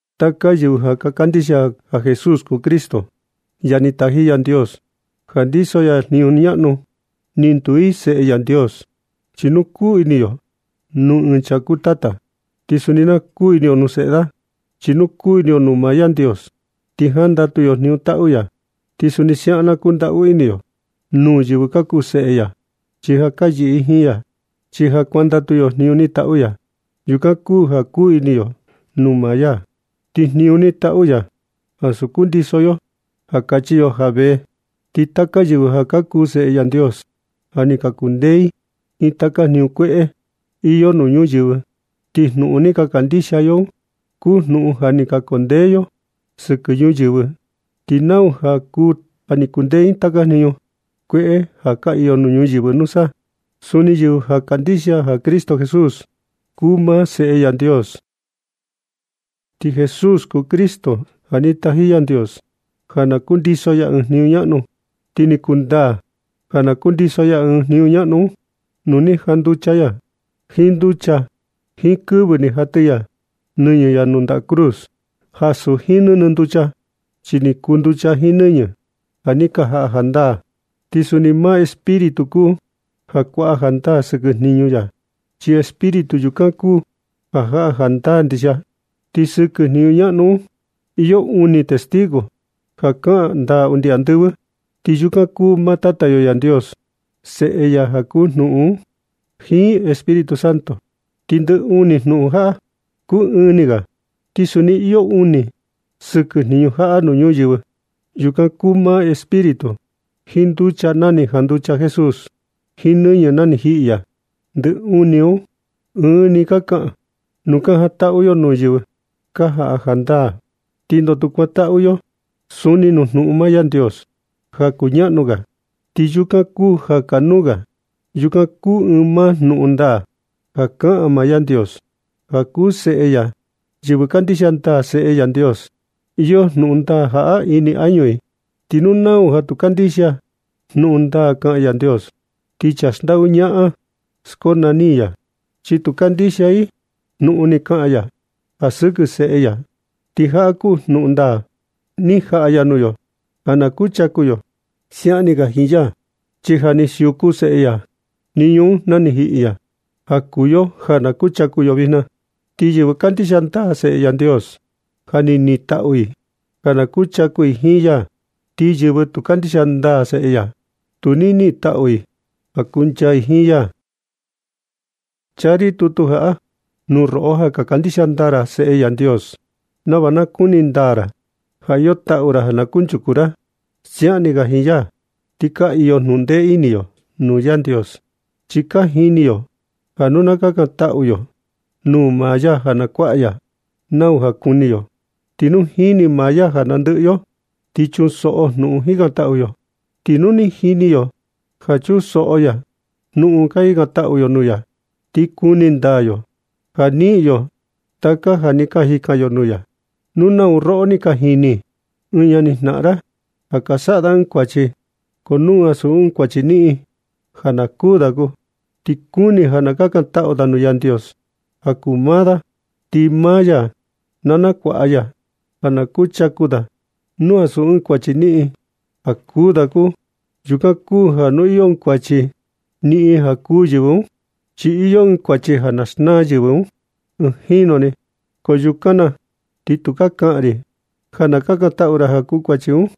Taka yɨvɨ ka kandixia ja Jesús kuu Cristo, ja ni taji Yandios ja ndiso ya jniñu ñaꞌnu, ni nduu i seꞌe Yandios. Chi nu kuu ini yo nuu ɨɨn chaa kuu tata, ti suni na kuu ini yo nuu seꞌe da. Chi nu kuu ini yo nuu maa Yandios, ti jandatu yo jniñu taꞌu ya. Ti suni siaꞌan na kundaꞌu ini yo nuu yɨvɨ ka kuu seꞌe ya, chi ja ka yɨꞌɨ i jiin ya. Chi ja kuandatu yo jniñu ni taꞌu ya, yukan kuu ja kuu ini yo nuu maa ya, ti jniñu ni taꞌu ya ansu kundiso yo ja kachi yo ja vee. Ti taka yɨvɨ ja ka kuu seꞌe Yandios ja ni ka kundee i jiin taka jniñu kueꞌe iyo nuu ñuyɨvɨ, ti jnuꞌun ni ka kandixia yo un kuu jnuꞌun ja ni ka kundee yo sɨkɨ ñuyɨvɨ. ¿Ti nau kuu ja kundee jiin taka jniñu kueꞌe ka iyo nuu ñuyɨvɨ nusa? Suu yɨvɨ kandixia ja Cristo Jesús kuu maa Seꞌe Yandios. Ti Jesús kuu Cristo ja ni taji Yandios ja na kundiso ya ɨɨn jniñu ñaꞌnu, ti ni kundaa ja kundiso ya jniñu ñaꞌnu un nuu ni janducha ya jiin nducha jiin kɨvɨ ni jatɨ ya nɨñɨ ya nuu ndaꞌa cruz. Ansu jiin nɨnɨ nducha, chi ni kuu nducha jiin nɨñɨ ja ni ka jaꞌa jandaa. Ti suni maa Espíritu kuu ja kuaꞌa jandaa sɨkɨ jniñu ya, chi Espíritu yukan kuu ja jaꞌa jandaa ndixia. Ti sɨkɨ jniñu ñaꞌnu un iyo uni testigo ja ka jaꞌa jandaa undi nuu andɨvɨ. Ti yukan kuu maa Tata yo Yandios, Seꞌe ya ja kuu jnuꞌun un, jiin Espíritu Santo. Ti ndɨ uni jnuꞌun jaꞌa kuu ɨɨn ni ga. Ti suni iyo uni sɨkɨ jniñu jaꞌa nuu ñuyɨvɨ. Yukan ka kuu maa Espíritu, jiin nducha na ni janducha Jesús, jiin nɨñɨ na ni jiꞌi ya. Ti ndɨ uni un, ɨɨn ni ka kaꞌan. Nu ka jantaꞌu yo nuu yɨvɨ ka jaꞌa jandaa, ti ndoo tu kuantaꞌu yo suni nuu jnuꞌun maa Yandios ja kuñaꞌnu ga, ti yukan kuu ja kanuu ga. Yukan kuu ɨɨn maa jnuꞌun ndaa ja kaꞌan maa Yandios ja kuu Seꞌe ya. Yɨvɨ kandixia ndaa seꞌe Yandios, iyo jnuꞌun ndaa jaꞌa ini añu i. Ti nau ja tu kandixia jnuꞌun ndaa kaꞌan Yandios, ti chaa xndaꞌu ñaꞌan skonani i ya, chi tu kandixia i jnuꞌun ni kaꞌan ya ja sɨkɨ Seꞌe ya. Ti jaꞌa kuu jnuꞌun ndaa ni jaꞌa ya nuu yo ja na kuchaku yo siaꞌan ni ga jiin ya. Chi ja ni siuku Seꞌe ya jniñu un na ni jiꞌi ya ja kuu yo ja na kuchaku yo jiin ya. Ti yɨvɨ kandixia ndaa Seꞌe Yandios, ja ni nitaꞌu i ja na kuchaku i jiin ya, ko yɨvɨ tu kandixia ndaa Seꞌe ya, tu ni nitaꞌu i ja na kuchaku i jiin ya. Chaa ri tutu jaꞌa nuu roꞌo ja kandixia ndaa ra Seꞌe Yandios, nava na kuni ndaa ra ja iyo taꞌu ra ja na kuchaku ra siaꞌan ni ga jiin ya. Ni ka iyo jnundee ini yo nuu Yandios, chi ka jini yo ja nu na kakantaꞌu yo nuu maa ya ja na kuaꞌa ya nau ja kuni yo, ti nu jini maa ya ja nandɨꞌɨ yo, ti chunsoꞌo jnuꞌun jikantaꞌu yo. Ti nu ni jini yo ja chunsoꞌo ya jnuꞌun ka jikantaꞌu yo nuu ya, ti kuni ndaa yo ja niꞌin yo taka ja ni ka jikan yo nuu ya. Nu nau roꞌo ni ka jini ɨɨn ñani jnaꞌan ra, ja ka saꞌa da ɨɨn kuachi, ko nu ansu ɨɨn kuachi niꞌin ja na kuū da kuu, ti kuni ja na kakantaꞌu ra nuu Yandios ja kuu maa da, ti maa ya na nakuaꞌa ya ja na kuchaku da, nu ansu ɨɨn kuachi niꞌin ja kuū da kuu. Yukan kuu ja nu iyo ɨɨn kuachi niꞌin ja na kuū yɨvɨ un, chi iyo ɨɨn kuachi ja na xnaa yɨvɨ un ɨɨn jinu ni, ko yukan na ti tukaa kaꞌan ri ja na kakantaꞌu ja kuu kuachi un.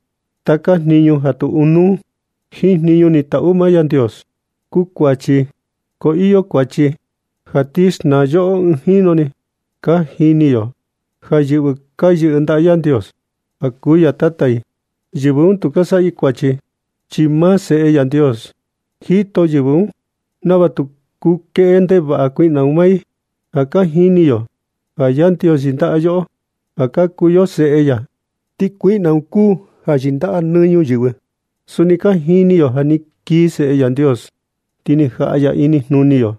Taka jniñu ja tu ɨɨn nuu jiin jniñu ni taꞌu maa Yandios kuu kuachi, ko iyo kuachi ja ti xnaa yoꞌo ɨɨn jinu ni. Ka jini yo ja yɨvɨ ka yɨꞌɨ ndaꞌa Yandios ja kuu ya Tata i, yɨvɨ un tu ka saꞌa i kuachi, chi maa Seꞌe Yandios jito yɨvɨ un nava tu kuu kueꞌe ndevaꞌa kuiꞌna un maa i. Ja ka jini yo ja Yandios yɨndaꞌa yoꞌo ja ka kuu yo seꞌe ya, ti kuiꞌna un kuu ja yɨndaꞌa nɨ ñuyɨvɨ. Suni ka jini yo ja ni kii Seꞌe Yandios, ti ni jaꞌa ya inijnuni yo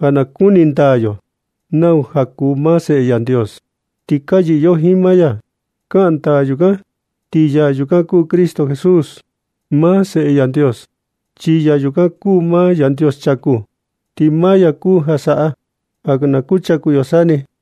ja na kuni ndaa yo nau kuu maa Seꞌe Yandios. Ti ka yɨꞌɨ yo jiin maa ya, kaꞌan ndaa yukan, ti yaa yukan kuu Cristo Jesús, maa Seꞌe Yandios. Chi yaa yukan kuu maa Yandios chaku, ti maa ya kuu ja saꞌa ja na kuchaku yo sa ni.